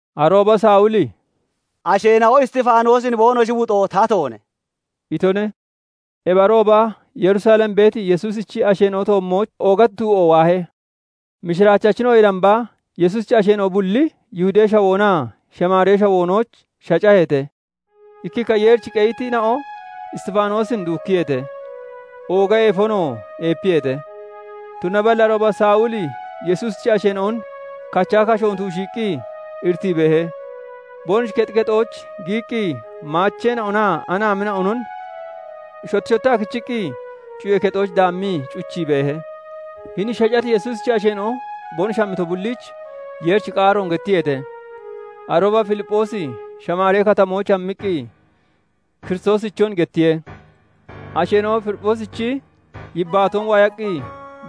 Arooba Sawuli "Asheena'o Isxifaanoosin boonoshi wuxoo tatoone" itone. Ebi arooba Yerusalem beeti Yesuusichi asheena'o toommooch oogati du'o waahe. Mishiraachachina'oyee damba Yesuusichi asheena'o bulli Yihudee Shawoonaa Shamaaree Shawoonooch shacaheete. Ikkikka Yeerich qeyitina'o Isxifaanoosin duukkiyeete; ooga eefonoo eepiyeete. Tunaballi arooba Sawuli Yesuusichi asheena'on kachaa kashoon tuushiiqqi iritii beehe; boonoshi kexi kexooch giyiqqi maacheena'onaa anaamina'onon shotti shottaa kichiqqi cuyee kexooch daammii cuchii beehe. Hini shacati Yesuusichi asheena'o boonoshi hammito bulliich Yeerichi qaaroon gettiyeete. Arooba Filipphoosi Shamaari Katamooch hammiqqi Kiristoosichon gettiye. Asheena'o Filipphoosichi yibbaatoon waayaqqi,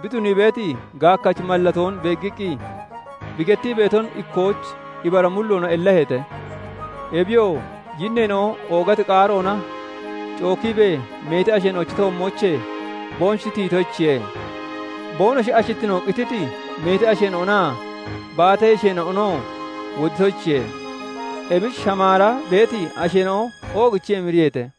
bi tunii beeti, gaakkachi mallatoon beeggiqqi, bi gettii beeton ikkooch ibara mulloona ellaheete. Ebiyoo yinneena'o oogati qaaroona cookiibee meeti asheena'ochi toommoochee boonoshi tiyitoyichiye; boonoshi ashittino qittiti meeti asheena'onaa baata yesheena'onoo woditoyichiye. Ebich Shamaara beeti asheena'o oogichii emiriyeete.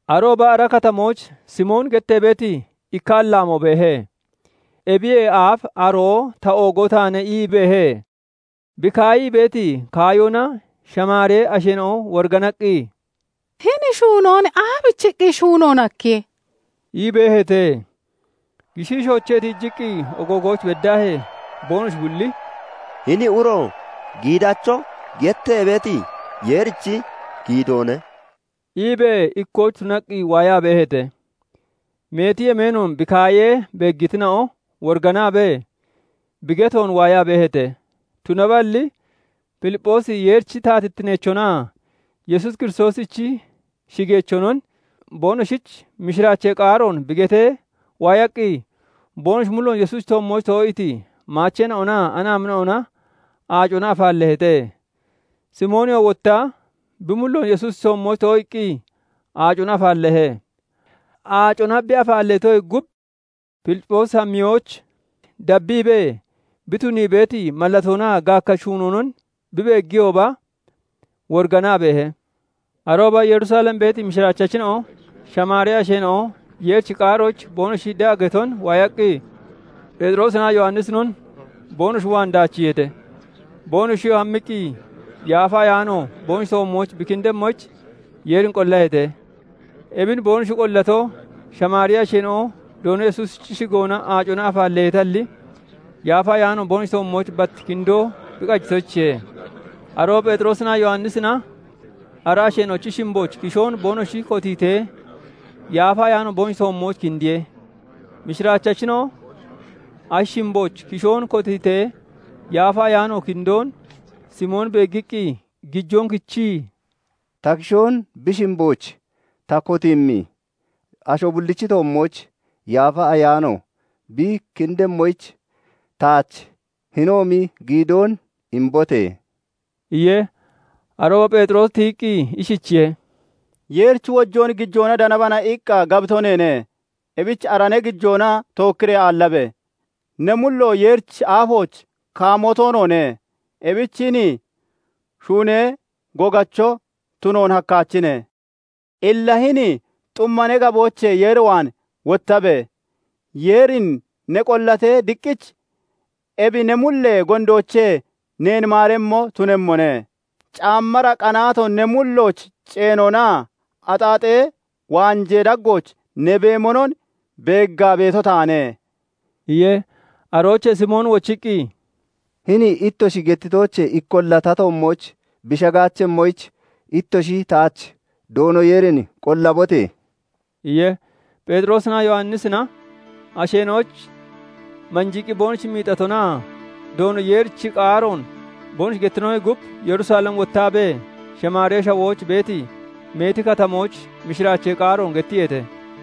Arooba ara katamooch Simooni gettee beeti ikka allaamoo beehe. Ebiyee aaf aroo "Ta oogoo taane" ii beehe; bi kaayii beeti kaayoona Shamaaree asheena'o woriganaqqi, "Hini shuunoon aabichiqqi shuunoon hakkiye?" ii beeheete. Gishiishoochee tiijiqii ogoogooch beddaahee boonoshi bulli "Hini uro 'Giidacho' gettee beeti Yeerichi giidoone" iibee ikkooch tunaqqi waayaa beeheete. Meeti yemeenoon bi kaayee beeggitina'o woriganaabee, bi getoon waayaa beeheete. Tunaballi Filipphoosi Yeerichi taatittineechonaa Yesuus Kiristoosichi shigeechonon boonoshich mishiraachee qaaroon bi getee waayaqqi, boonoshi mulloon Yesuusichi toommooch too'iiti maacheen'onaa anaamina'ona aacona afaalleeheete. Simooniyoo wotta bi mulloon Yesuusichi toommooch too'iiqqi aacona afaalleehe. Aacona bi afaalleetoyee gub, Filipphoosi hammiyooch dabbiibee bi tunii beeti mallatoonaa gaakkachi shuunoonon bi beeggiyooba woriganaa beehe. Arooba Yerusalem beeti mishiraachachina'o Shamaaree asheena'o Yeerichi qaaroyich boonoshi de'a geton waayaqqi, Pheexiroosinaa Yowannisinon boonoshi waan daachiiheete. Boonoshiyoo hammiqqi, Yaafa Ayaano boonoshi toommooch bi kindemmoyich, Yeerin qollaheete; ebin boonoshi qollato, Shamaaree asheena'o Doono Yesuusichi shigoona aacona afaalleeteetalli, Yaafa Ayaano boonoshi toommooch bat kindoo bi qajitoyichiye. Arooba Pheexiroosinaa Yowannisina ara asheena'ochi shimbooch kishoon boonoshi kotiitee, Yaafa Ayaano boonoshi toommooch kindiye. Mishiraachachina'o ashi shimbooch kishoon kotiitee, Yaafa Ayaano kindoon Simoon beeggiqqi gijoon kichii, "Ta kishoon bi shimbooch ta kotiimmi asho bullichi toommooch Yaafa Ayaano bi kindemmoyich, taach hinoomi giidoon imbote!" iye. Arooba Pheexiroosi tiyiqqi ishichiye:- " 'Yeerichi wojoon gijoona danabana' iqqa gabito neene; ebich ara ne gijoona tookkiree aallabe! Ne mullo Yeerichi aafooch kaamoo toonoone; ebich hini shuunee gogacho tunoon hakkaachine. Illa hini xumma ne gaboochee Yeer waan wottabe! Yeerin ne qollatee, diqqich ebi ne mullee gondoochee neen maaremmo tunemmone. Caammara qanaato ne mullooch ceenonaa axaaxee waanjee daggooch ne beemonon beeggaa beeto taane" iye. Aroochee Simooni wochiqqi, "Hini ittoshi gettitoochee ikkolla ta toommooch bi shagaachemmoyich ittoshi taach Doono Yeerin qollabote!" iye. Pheexiroosinaa Yowannisna asheena'oyich manjiiqqi boonoshi miixatonaa Doono Yeerichi qaaroon boonoshi gettitonoyee gub, Yerusalem wottaabee Shamaaree Shawooch beeti meeti katamooch mishiraachee qaaroon gettiyeete.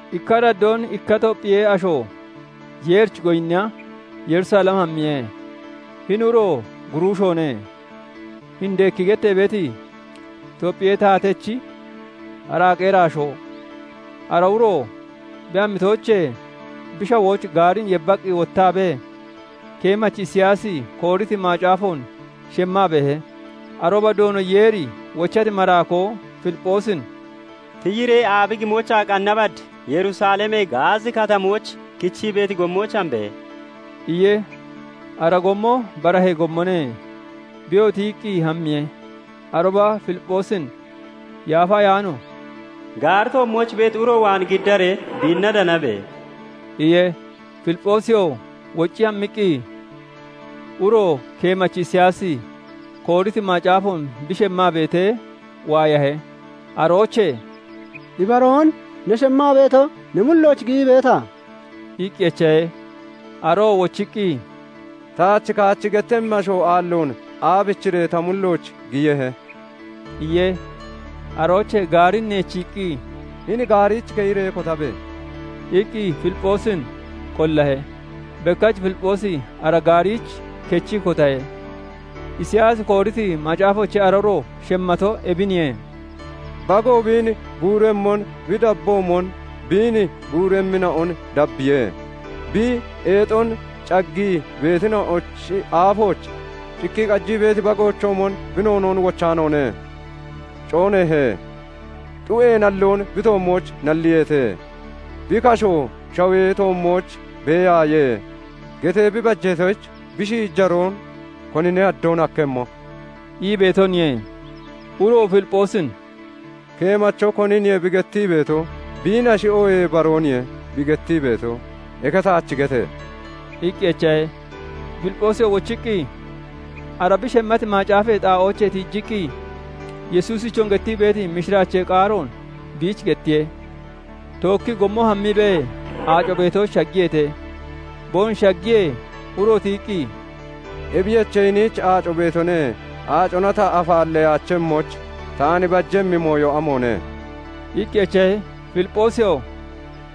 Ikka araddoon ikka Topphiyee asho Yeerich goyinniya Yerusalem hammiye. Hini uro guruushoone; Hindeeki gettee beeti Topphiyee taatechi araaqee iraashoo. Ara uro bi hammitoochee bi shawooch gaarin yebbaqqi wottaabee, keemachi Isiyaasi kooriti macaafoon shemmaa beehe. Arooba Doono Yeeri wochati maraakoo Filipphoosin "Tiyiree aabi gimoochaa qanna bad Yerusalemee Gaazi Katamooch kichii beeti gommooch hambe!" iye. Ara gommo barahee gommone. Biyoo tiyiqqi hammiye. Arooba Filipphoosin Yaafa Ayaano "Gaari toommooch beeti uro waan giddaree biinna danabe!" iye. Filipphoosiyoo woccii hammiqqi, uro keemachi Isiyaasi kooriti macaafoon bi shemmaa beetee waayahe. Aroochee "Ibaroon ne shemmaa beeto ne mullooch giyii beeta?" iqqi echahe. Aroo wochiqqi, "Taach kaachi gettemmi asho aalloon aabichiree ta mullooch giyehe?" iye. Aroochee gaarin neechiiqqi, "Hini gaariich keyiree kotabe!" iqqi Filipphoosin qollahe. Bekkach Filipphoosi ara gaariich kechii kotahe. Isiyaasi kooriti macaafoochee ara uro shemmato ebiniye:- "Bago biin guuremmon bi dabboomon biin guuremmina'on dabbiye; bi eexon caggii beetina'ochi aafooch cikkii qajii beeti bagoochoomon bi noonoon wochaanoone. Cooneehe; xu'ee nalloon bi toommooch nalliyeete; 'Bi kasho shawee toommooch beeyaaye!' getee bi bajeetoyich, bi shiijaroon konine haddoon hakkemmo?" ii beetoniye. Uroo Filipphoosin "Keemacho koniniye bi gettii beeto? Biinnashi, oohee barooniye bi gettii beeto? Eke taach gete!" iqqi echahe. Filipphoosiyoo wochiqqi ara bi shemmati macaafee xaa'oochee tiijiqqi, Yesuusichon gettii beeti mishiraachee qaaroon biich gettiye. Tookkii gommo hammiibee aaco beetooch shaggiyeete; boonoshi shaggiyee, uro tiyiqqi, "Ebiyoche, hiniich aaco beetone; aacona ta afaalleyaachemmoyich, taan bajemmi mooyo amoone?" iqqi echahe. [Filipphoosiyoo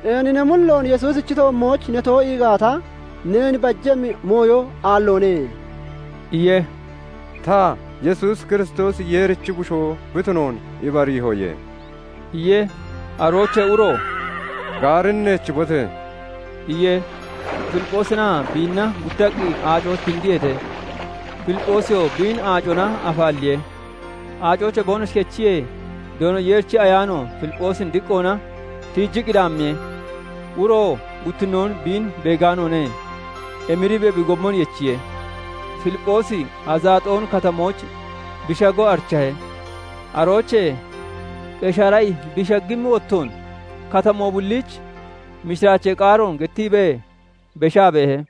"Ceeni ne mulloon Yesuusichi toommooch ne too'ii gaata, neen bajemmi mooyo aalloone" iye. "Ta, Yesuus Kiristoosi Yeerichi Bushoo bi tunoon ibariihoye" iye.] Aroochee uro "Gaarin neechibote!" iye. Filipphoosinaa biinna guttaqqi aacooch kindiyeete; Filipphoosiyoo biin aacona afaalliye. Aacoochee boonoshi kechiyee, Doono Yeerichi Ayaano Filipphoosin diqqoona tiijiqqi daammiye. Uroo guttinnoon biin beegaanoone; emiriibee bi gommon yechiye. Filipphoosi Azaxooni Katamooch bi shago arichahe; aroochee Qeshaarai bi shaggimmi wottoon katamoo bulliich mishiraachee qaaroon gettiibee beshaa beehe.